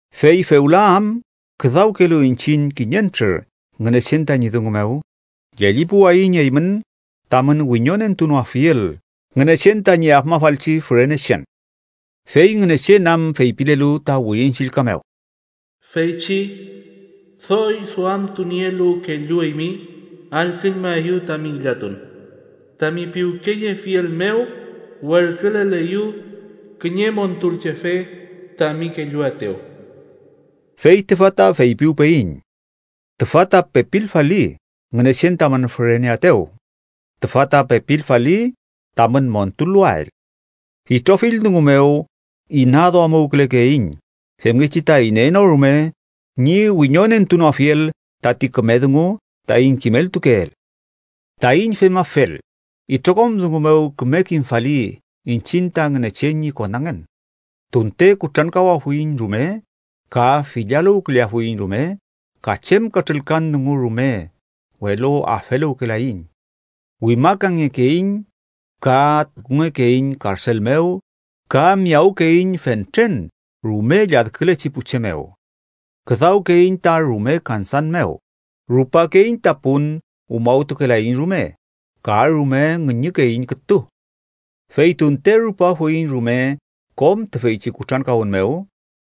Fey fewla am küdawkelu iñchiñ kiñentrür Ngünechen tañi dungu mew, llellipuwayiñ eymün tamün wiñonentunoafiel Ngünechen tañi afmafalchi fürenechen. Fey Ngünechen am feypilelu ta Wirin Chillka mew: “Feychi doy duamtunielu kellu eymi allküñmaeyu tami ngillatun, Tami piwkeyefiel mew werküleleyu kiñe Montulchefe tami kelluaetew.” Fey tüfa ta feypiwpeyiñ: ¡Tüfa ta pepilfali Ngünechen tamün füreneaetew! ¡Tüfa ta pepilfali tamün montuluwael! Itrofill dungu mew inaduamuwkülekeiñ femngechi ta iney no rume ñi wiñonentunoafiel tati küme dungu taiñ kimeltukeel. Taiñ femafel, itrokom dungu mew küme kimfali iñchiñ ta Ngünechen ñi konangen. Tunte kutrankawafuiñ rume, ka fillaluwküleafuiñ rume, ka chem katrülkan dungu rume, welu afeluwkelaiñ. Wimakangekeiñ, ka tukungekeiñ karsel mew, ka miyawkeiñ fentren rume lladkülechi pu che mew. Küdawkeiñ ta rume kansan mew, rupakey ta pun umawtukelaiñ rume ka rume ngüñükeiñ kütu. Fey tunte rupafuiñ rume kom tüfeychi kutrankawün mew,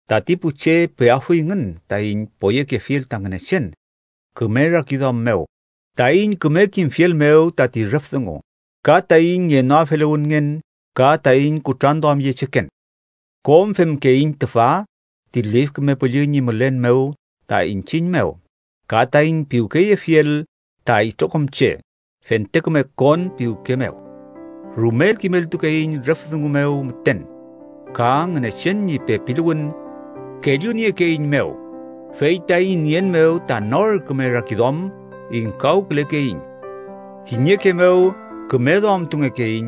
tati pu che peafuyngün taiñ poyekefiel ta Ngünechen küme rakiduam mew taiñ küme kimfiel mew tati rüf dungu, ka taiñ ngenoafeluwünngen ka taiñ kutranduamyecheken. Kom femkeiñ tüfa ti Lif Küme Püllü ñi mülen mew ta iñchiñ mew, ka taiñ piwkeyefiel ta itrokom che fente küme kon piwke mew. Rumel kimeltukeiñ rüf dungu mew müten, ka Ngünechen ñi pepiluwün kelluniekeeiñmew, fey taiñ nien mew ta nor küme rakiduam, ingkawkülekeiñ. Kiñeke mew küme duamtungekeiñ,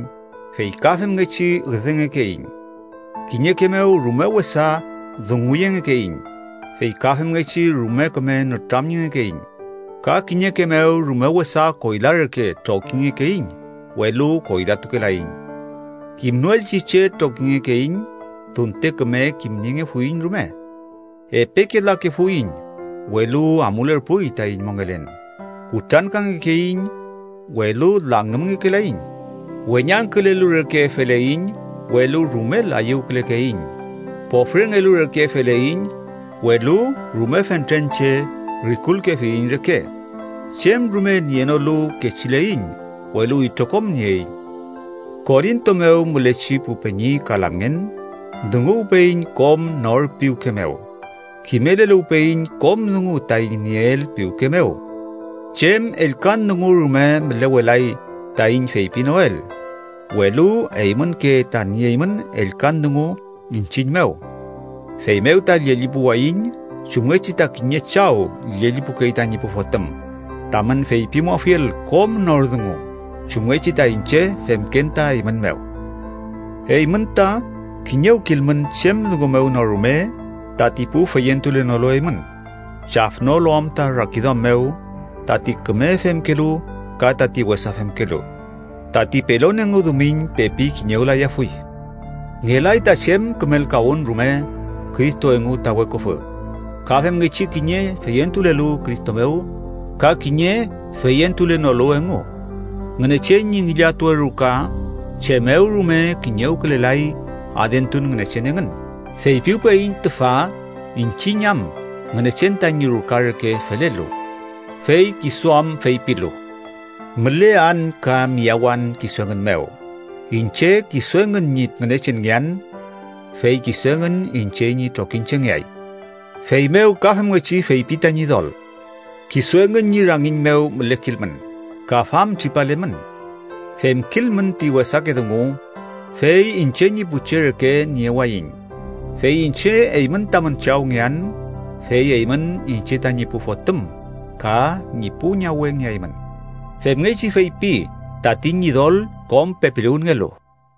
fey ka femngechi üdengekeiñ. Kiñeke mew rume wesa dunguyengekeiñ, fey ka femngechi rume küme nütramyengekeiñ. Ka kiñeke mew rume wesa koyla reke trokingekeiñ, welu koylatukelaiñ. Kimnoelchi che trokingekeiñ, tunte küme kimniengefuiñ rume. Epeke lakefuiñ, welu amulerpuy taiñ mongelen. Kutrankangekeiñ, welu langümngekelaiñ. Weñangkülelu reke feleiñ, welu rumel ayüwkülekeiñ. Pofrengelu reke feleiñ, welu rume fentren che rikulkefiyiñ reke. Chem rume nienolu kechileiñ, welu itrokom nieiñ. Korinto mew mülechi pu peñi ka lamngen, dunguwpeyiñ kom nor piwke mew. Kimeleluwpeyiñ kom dungu taiñ nieel piwke mew. Chem ellkan dungu rume mülewelay taiñ feypinoel, welu eymünke ta nieymün ellkan dungu iñchiñ mew. Feymew ta llellipuwayiñ, chumngechi ta kiñe chaw llellipukey tañi pu fotüm, tamün feypimuafiel kom nor dungu, chumngechi ta iñche femken ta eymün mew. Eymün ta kiñewkilmün chem dungu mew no rume tati pu feyentulenolu eymün, chafnolu am ta rakiduam mew tati küme femkelu ka tati wesa femkelu. Tati pelon engu dumiñ pepi kiñewlayafuy. Ngelay ta chem kümelkawün rume Cristo engu ta weküfü, ka femngechi kiñe feyentulelu Cristo mew ka kiñe feyentulenolu engu. Ngünechen ñi ngillatuwe ruka chem mew rume kiñewkülelay adentun ngünechen engün. Feypiwpeyiñ tüfa iñchiñ am Ngünechen tañi ruka reke felelu. Fey kisu am feypilu: “Mülean ka miyawan kisu engün mew. Iñche kisu engün ñi Ngünechenngean. Fey kisu engün iñche ñi trokiñchengeay.” Feymew ka femngechi feypi ta Ñidol: “Kisu engün ñi rangiñ mew mülekilmün, ka famtripalemün. Femkilmün ti wesake dungu Fey iñche ñi pu che reke niewayiñ. Fey iñche eymün tamün Chawngean, Fey eymün iñche tañi pu fotüm ka ñi pu ñawengeaymün. Femngechi feypi tati Ñidol kom pepiluwünngelu.”